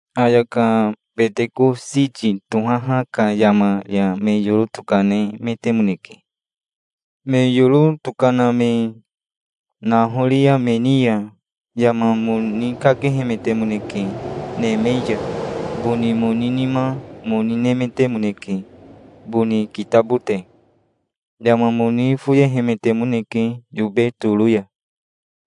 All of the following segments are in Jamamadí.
Ayaka Betekositi tohaha ka yama ya me yoro tokanemetemoneke. Me yoro tokana me nahoria me ni ya yama moni kakehemetemoneke neme ya. Boni moni nima moni nemetemoneke, boni kitabote. Yama moni foyehemetemoneke yobe toro ya.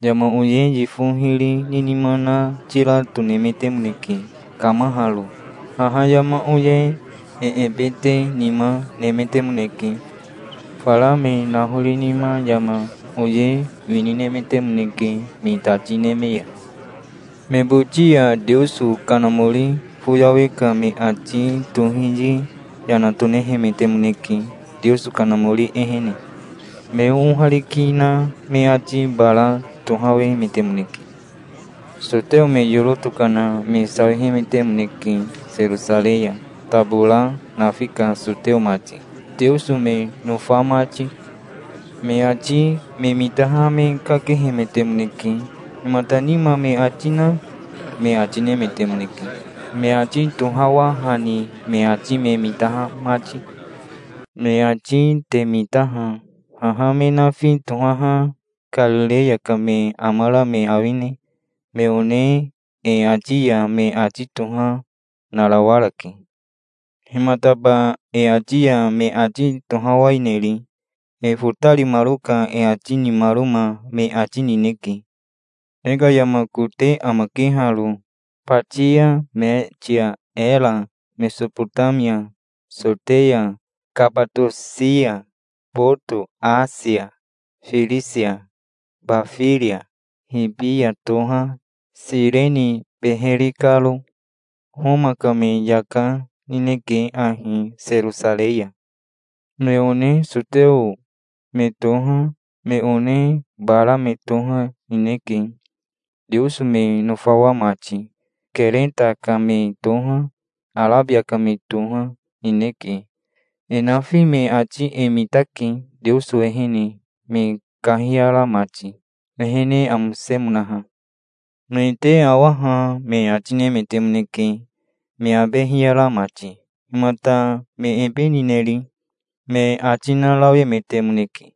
Yama oye yifo hiri ni nima na tira tonemetemoneke, kamaharo. Haha yama oye e ebete nima nemetemoneke. Fara me nahori nima yama oye wini nemetemoneke me tati neme ya. Me boti ya Teoso Kanamori foyawe ka me ati tohiyi yana tonehemetemoneke Teoso Kanamori ehene. Me oohariki na me ati bara tohawemetemoneke. Soteo me yoro tokana me sawihemetemoneke Serosarei ya, tabora nafi ka soteo mati, Teoso me nofa mati. Me ati me mitaha me kakehemetemoneke. "Himata nima me ati na?" me ati nemetemoneke, me ati tohawahani me ati me mitaha mati. "Me ati te mita ha. Haha me nafi tohaha Karireya ka me amara me awine? Me one e ati ya me ati toha narawarake. Himataba e ati ya me ati tohawaineri? E fotarimaro ka e ati nimaroma me ati nineke. E ka yama kote amake haro. Batia, Metia, Era, Mesobotamia, Soteya, Kabatosia, Boto, Asia, Firisia, Bafiria, Ribia toha, Sireni beheri karo. Homa ka me yaka, nineke ahi Serosarei ya. Me one soteo me toha, me one bara me toha, nineke, Teoso me nofawa mati. Kereta ka me toha, Arabia ka me toha, nineke. E nafi me ati e mitake Teoso ehene me kahiyara mati, ehene amosemonaha. Me te awa ha", me ati nemetemoneke, me abe hiyara mati. "Himata me ebe nineri?" me ati narawemetemoneke.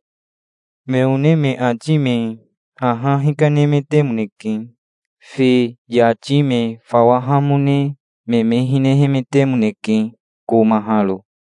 Me one me ati me haha hikanemetemoneke. Fi yati me fawahamone me me hinehemetemoneke komaharo.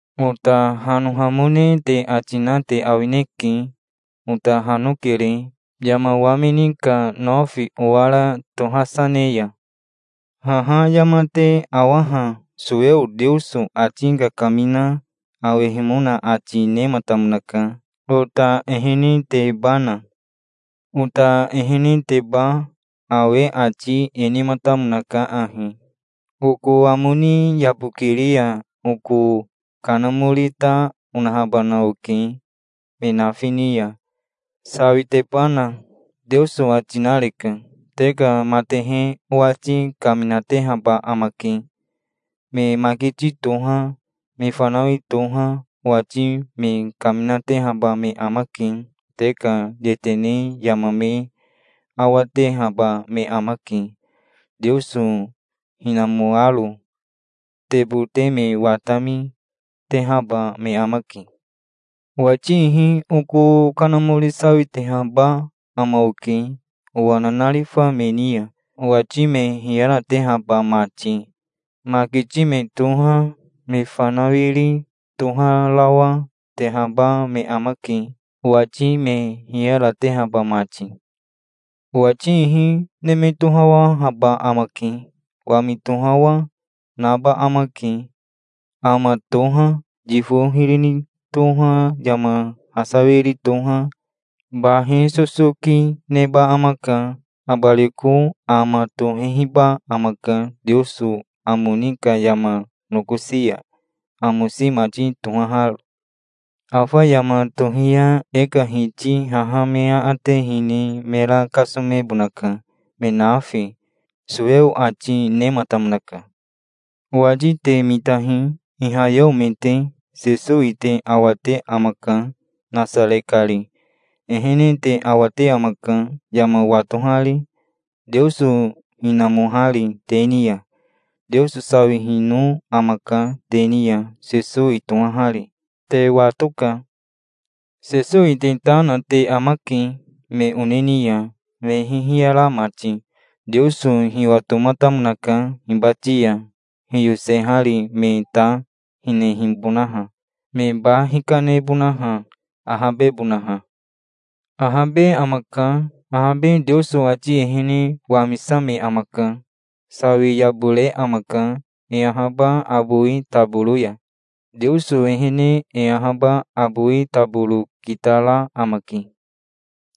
Ota hanohamone te ati na te awineke. Ota hanokere, yama wamini ka nofi owara tohasa ne ya. Haha yama te awaha Soweo Teoso ati kakamina awehimona ati nematamonaka, ota ehenetebana. Ota eheneteba awe ati e nematamonaka ahi: '"Oko amo ni yabokiri ya oko Kanamori ta onahabana oke me nafi ni ya, sawitebana", Teoso ati nareka. "Te ka matehe owati kaminatehaba amake. Me makiti toha, me fanawi toha, owati me kaminatehaba me amake. Te ka yetene yama me awatehaba me amake, Teoso hinamoaro. Te bote me watami, tehaba me amake. Owati ihi oko Kanamori sawitehaba ama oke owa nanarifa me ni ya, owati me hiyaratehaba mati. Makiti me toha, me fanawiri toharawa, tehaba me amake, owati me hiyaratehaba mati. Owati ihi neme tohawahaba amake. Wami tohawa, naba amake. Ama toha, yifo hiri ni toha, yama hasawiri toha, bahi sosoki, neba amaka. Abariko ama tohehiba amaka Teoso amo ni ka yama nokosi ya, amosi mati tohaharo. Afa yama tohi ya e ka Hiti haha me aate hine mera kasomebonaka, me nafi"', Soweo ati nematamonaka". "Owati te mitahi, ihayeo me te. Sesowi te awate amaka, Nasare kari. Ehene te awate amaka, yama watohari, Teoso hinamohari te ni ya. Teoso sawihino amaka te ni ya, Sesowi tohahari. Te watoka. Sesowi te ta na te amake, me one ni ya, me ihi hiyara mati. Teoso hiwatomatamonaka hibati ya hiyosehari me ta hinehibonaha, me ba hikanebonaha, ahabebonaha. Ahabe amaka. Ahabe Teoso ati ehene wamisame amaka. Sawi yabore amaka, e ahaba abowi taboro ya. Teoso ehene e ahaba abowi taboro kitara amake".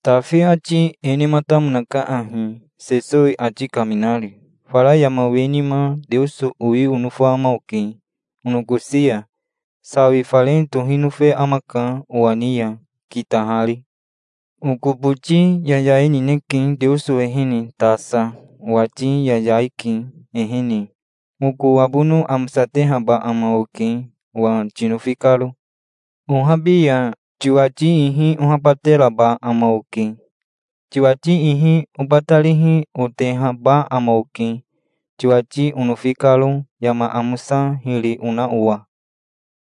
"Tafi ati e nematamonaka ahi, Sesowi ati kaminari: 'Fara yama we nima Teoso owi onofa ama oke onokosi ya. Sawi fare tohi nofe amaka owa ni ya kitahari. Oko boti yayai nineke Teoso ehene tasa. Owati yayai ke, ehene. Oko abono amosatehaba ama oke owa tinofi karo. Ohabi ya tiwati ihi ohabateraba ama oke. Tiwati ihi obatarihi otehaba ama oke, tiwati onofi karo, yama amosa hiri ona owa.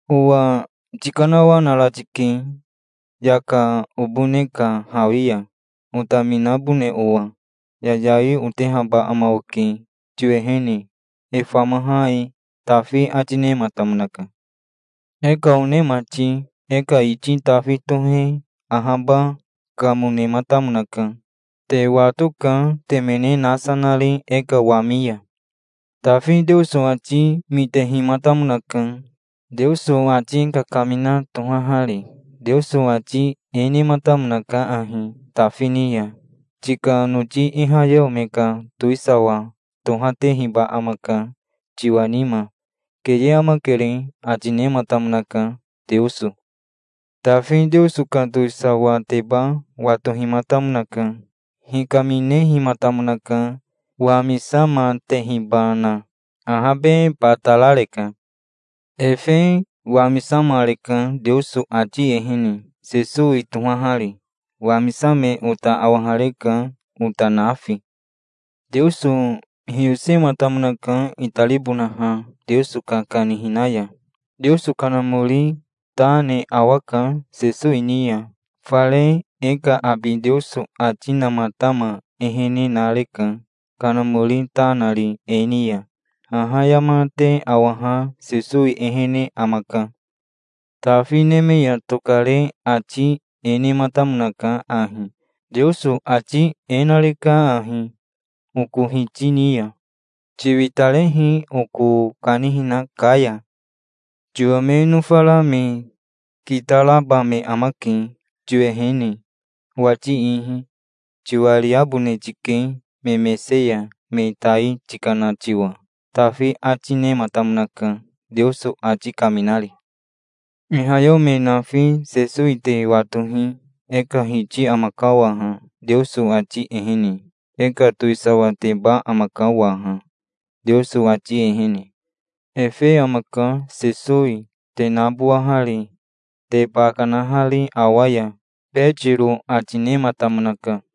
Owa tikanawanara tike, yaka obone ka hawi ya, otaminabone owa. Yayai otehaba ama oke tiwehene, e famaha e', Tafi ati nematamonaka". "E ka one mati, e ka iti Tafi tohe ahaba, kamo, nematamonaka. Te watoka, temene nasa nari e ka wami ya. Tafi Teoso ati mitehimatamonaka, Teoso ati kakamina tohahari. Teoso ati e nematamonaka ahi Tafi ni ya: 'Tika noti ihayeo me ka towisawa tohatehiba amaka tiwa nima. Keye amakere', ati nematamonaka, Teoso. Tafi Teoso ka towisawateba watohimatamonaka. Hikaminehimatamonaka, wamisamatehibana. Ahabe batarareka. Efe wamisamareka Teoso ati ehene, Sesowi tohahari. Wamisame ota awahareka, ota nafi. Teoso hiyosematamonaka itaribonaha Teoso ka kanihina ya. Teoso Kanamori ta ne awaka Sesowi ni ya. Fare e ka abi Teoso ati namatama ehene nareka Kanamori ta nari e ni ya. Haha yama te awaha Sesowi ehene amaka. Tafi neme ya tokare ati e nematamonaka ahi: 'Teoso ati e nareka ahi, oko Hiti ni ya: "Tiwitarehi oko kanihina ka ya. Tiwa me nofara me kitaraba me amake tiwehene, owati ihi. Tiwariabone tike me mese ya, me tai tikana tiwa"', Tafi ati nematamonaka Teoso ati kaminari". "Ihayeo me nafi Sesowi te watohi. E ka Hiti amaka waha Teoso ati ehene. E ka towisawateba amaka waha, Teoso ati ehene. Efe amaka, Sesowi, te nabowahari, te ba kanahari awa ya", Betiro ati nematamonaka.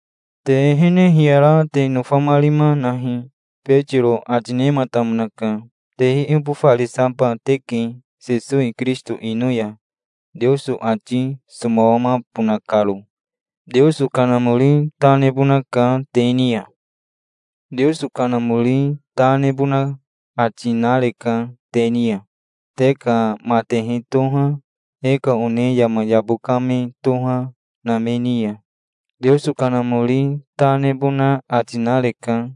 "Te ehene hiyara te nofamarima nahi", Betiro ati nematamonaka. Te iibofarisaba teke Sesowi Kirisito ino ya Teoso ati somawamabona karo. Teoso Kanamori ta nebonaka te ni ya. Teoso Kanamori ta nebona ati nareka te ni ya. Te ka matehe toha, e ka one yama yabo ka me toha, na me ni ya Teoso Kanamori ta nebona ati nareka.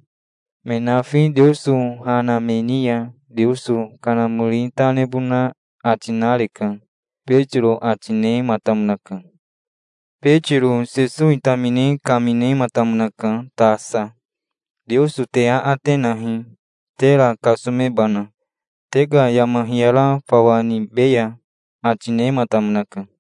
Me nafi Teoso ha na me ni ya Teoso Kanamori ta nebona ati nareka", Betiro ati nematamonaka. Betiro Sesowi tamine kaminematamonaka tasa. "Teoso te aate nahi, tera kasomebana. Te ka yama hiyara fawa nibeya", ati nematamonaka.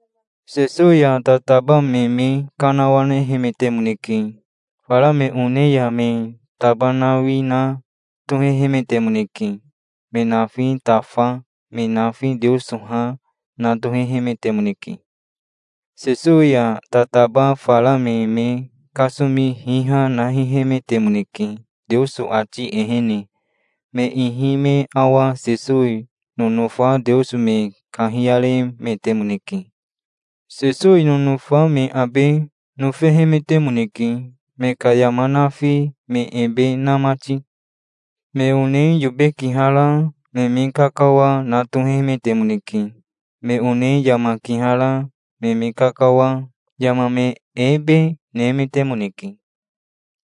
Sesowi ya tataba me me kanawanehemetemoneke. Fara me one ya me tabanawi na tohehemetemoneke. Me nafi tafa, me nafi Teoso ha, na tohehemetemoneke. Sesowi ya tataba fara me me kasomi hiha, na hihehemetemoneke, Teoso ati ehene. Me ihi me awa Sesowi nonofa Teoso me kahiyaremetemoneke. Sesowi nonofa me abe nofehemetemoneke, me ka yama nafi me ebe na mati. Me one yobe kihara me me kakawa, na tohehemetemoneke. Me one yama kihara me me kakawa, yama me ebe, nemetemoneke.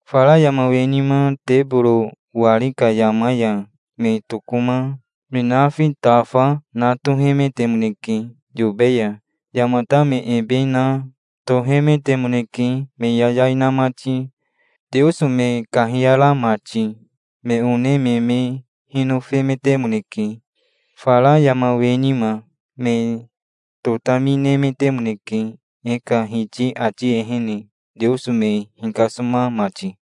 Fara yama we nima teboro wari ka yama ya me tokoma, me nafi tafa, na tohemetemoneke yobe ya. Yamata me ebe na tohemetemoneke me yayai na mati, Teoso me kahiyara mati. Me one me me hinofemetemoneke. Fara yama we nima me totami nemetemoneke e ka Hiti ati ehene, Teoso me hikasoma mati.